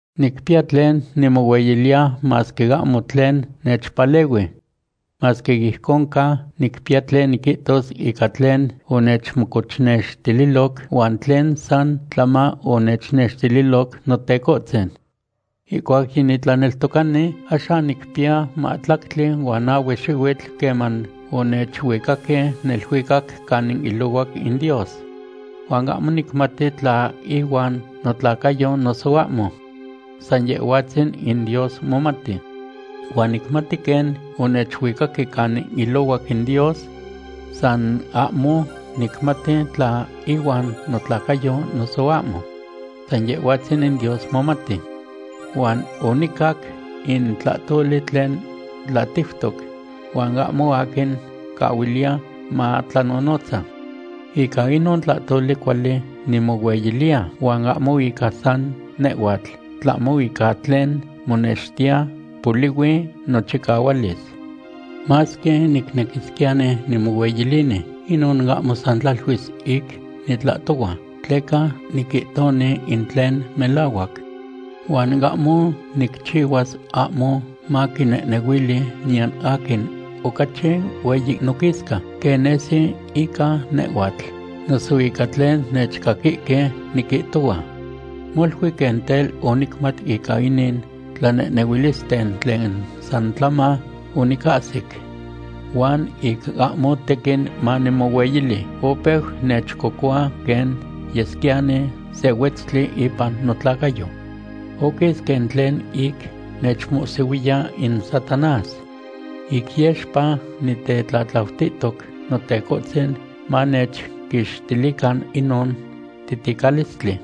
Nicpiya tlen nimohueyiliya masque ahmo tlen nechpalehui. Masque ijcon ca, nicpiya tlen niquihtos ica tlen onechmocochnextililoc huan tlen san tlama onechnextililoc Notecohtzin. Ihcuac yinitlaneltocani, axan quipiya mahtlactli huan nahue xihuitl queman onechuicayahque neluicac canin ilohuac in Dios. Huan ahmo nicmati tla ihuan notlacayo noso ahmo. San Yehhuatzin in Dios momati. Huan nicmati quen onechuicaque canin ilohuac in Dios. San ahmo nicmati tla ihuan notlacayo noso ahmo. San Yehhuatzin in Dios momati. Huan onicac in tlahtoli tlen tlatiutoc huan ahmo aquin mocahuiliya matlanonotza. Ica inon tlahtoli cuali nimohueyiliya huan ahmo ica san nehhuatl, tlahmo ica tlen monextiya polihui nochicahualis. Masque nicnequisquiyani nimohueyilini, inon ahmo san tlaluis ic nitlahtohua, tleca niquihtoni in tlen melahuac. Huan ahmo nicchihuas, ahmo maquinehnehuili niyan aquin ocachi hueyi noquisca quen nesi ica nehhuatl noso ica tlen nechcaquihque niquihtohua. Molui quen tel onicmat ica inin tlanehnehuilisten tlen san tlama onicahsic. Huan ic ahmo tequin manimohueyili, opeu nechcocohua quen yesquiyani se huetztli ipan notlacayo. Oquis quen tlen ic nechmohsihuiya in Satanás. Ic yexpa nitetlatlautihtoc Notecohtzin manechquixtilican inon titicalistli.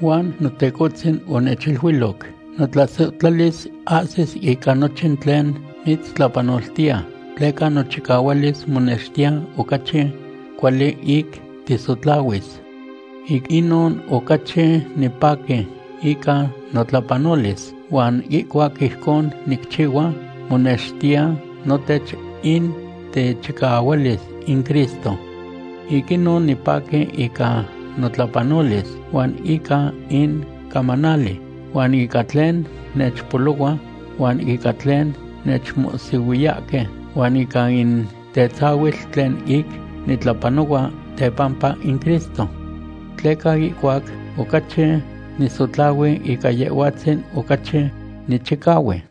Huan Notecohtzin onechiluiloc: “Notlasohtlalis ahsis ica nochin tlen mitztlapanoltiya, tleca nochicahualis monextiya ocachi cuali ic tisotlahuis.” Ic inon ocachi nipaqui ica notlapanolis, tleca ihcuac ijcon nicchihua, monextiya notech in techicahualis in Cristo. Ic inon nipaqui ica notlapanolis, huan ica in camanali, huan ica tlen nechpolohua, huan ica tlen nechmohsihuiyahque, huan ica in tetzahuitl tlen ic nitlapanohua tepampa in Cristo. Tleca ihcuac ocachi nisotlahui, ica Yehhuatzin ocachi nichicahui.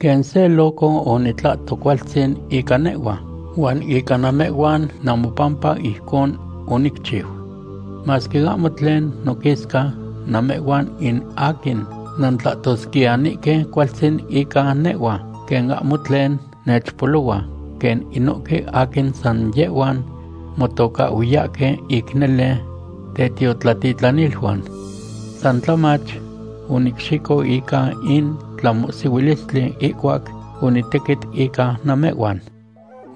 Quen se loco onitlahto cualtzin ica nehhua, huan ica namehhuan namopampa ijcon onicchiu. Masque ahmo tlen noquisca, namehhuan in aquin nantlahtosquiyanihque cualtzin ica nehhua, quen ahmo tlen nechpolohua quen inohque aquin san yehhuan motocahhuiyahque ic nele tetiotlatitlaniluan. San tlamach onicxico ica in tlamohsihuilistli ihcuac onitequit ica namehhuan.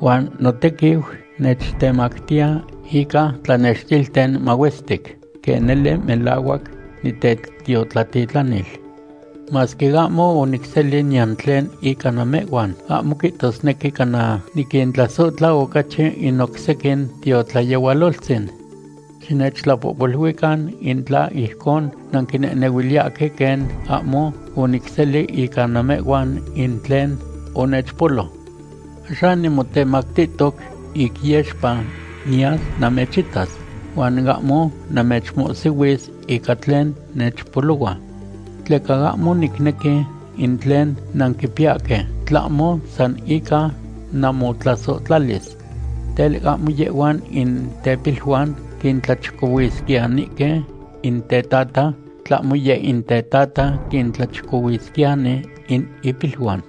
Huan notequiu nechtemactiya ica tlanextilten mahuestic quen nele melahuac nitetiotlatitlanil. Masque ahmo onicseli niyan tlen ica namehhuan, ahmo quihtosnequi cana niquintlasohtla ocachi in oc sequin tiotlayehualoltzin. Xinechtlapohpoluican in tla ijcon nanquinehnehuiliyahque quen ahmo onicseli ica namehhuan in tlen onechpolo. Axan nimotemactihtoc ic yexpa niyas namechitas, huan ahmo namechmohsihuis ica tlen nechpolohua. Tleca ahmo nicnequi in tlen nanquipiyahque, tlahmo san ica namotlasohtlalis. Tel, ahmo yehhuan in tepiluan quintlachicohuisquiyanihque in tetata, tlahmo yeh in tetata quintlachicohuisquiyani in ipiluan.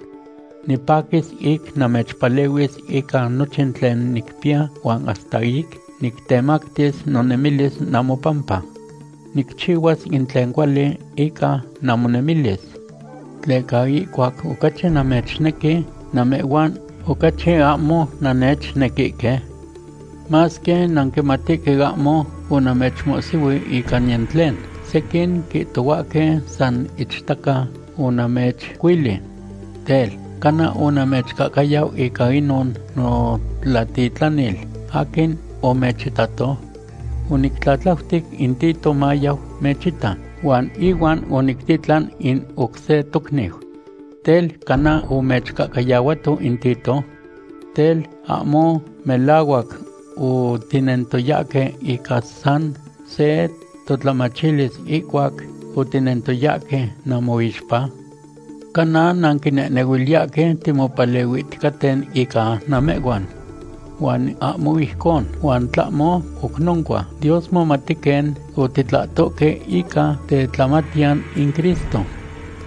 Nipaquis ic namechpalehuis ica nochin tlen nicpiya huan hasta ic nictemactis nonemilis namopampa. Nicchihuas in tlen cuali ica namonemilis. ¿Tleca ihcuac ocachi namechnequi, namehhuan ocachi ahmo nannechnequihque? Masque nanquimatihque ahmo onamechmohsihui ica niyan tlen, sequin quihtohuahque san ichtaca onamechcuili. Tel, ¿cana onamechcahcayau ica inon notlatitlanil aquin omechitato? Onictlatlautic in Tito mayau mechita huan ihuan onictitlan in oc se tocniu. Tel, ¿cana omechcahcayahuato in Tito? Tel, ¿ahmo melahuac otinentoyahque ica san se totlamachilis ihcuac otinentoyahque namoixpa? Cana nanquinehnehuiliyahque timopalehuihticaten ica namehhuan. Huan ahmo ijcon, in tlahmo oc noncua Dios momati quen otitlahtohque ica tetlamatiyan in Cristo.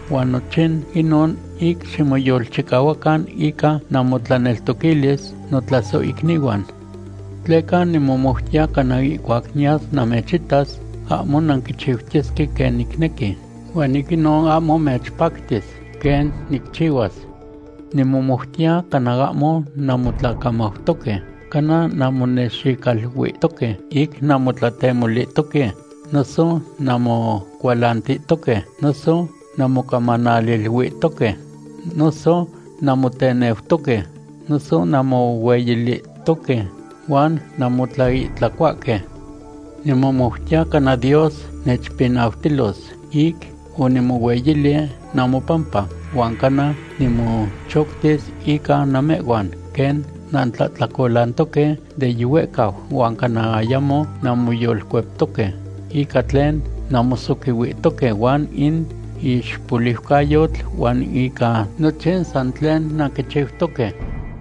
Huan nochin inon ic ximoyolchicahuacan ica namotlaneltoquilis, notlasohicnihuan. Tleca nimomoutiya cana ihcuac niyas namechitas, ahmo nanquichiutiyesque quen nicnequi, huan ic inon ahmo mechpactis quen nicchihuas. Nimomoutiya cana ahmo nanmotlacamautoque, cana nanmonexicaluihtoque ic nanmotlatemolihtoque, noso nanmocualantihtoque, noso nanmocamanaliluihtoque, noso nanmoteneutoque, noso nanmohueyilihtoque, huan nanmotlaihtlacohuahque. Nimomoutiya cana Dios nechpinautilos ic onimohueyili namopampa, huan cana nimochoctis ica namehhuan quen nantlahtlacolantoque de yihuehcau huan cana ayamo nanmoyolcueptoque ica tlen nanmosoquihuihtoque huan in ixpoliucayotl huan ica nochin san tlen nanquichiutoque.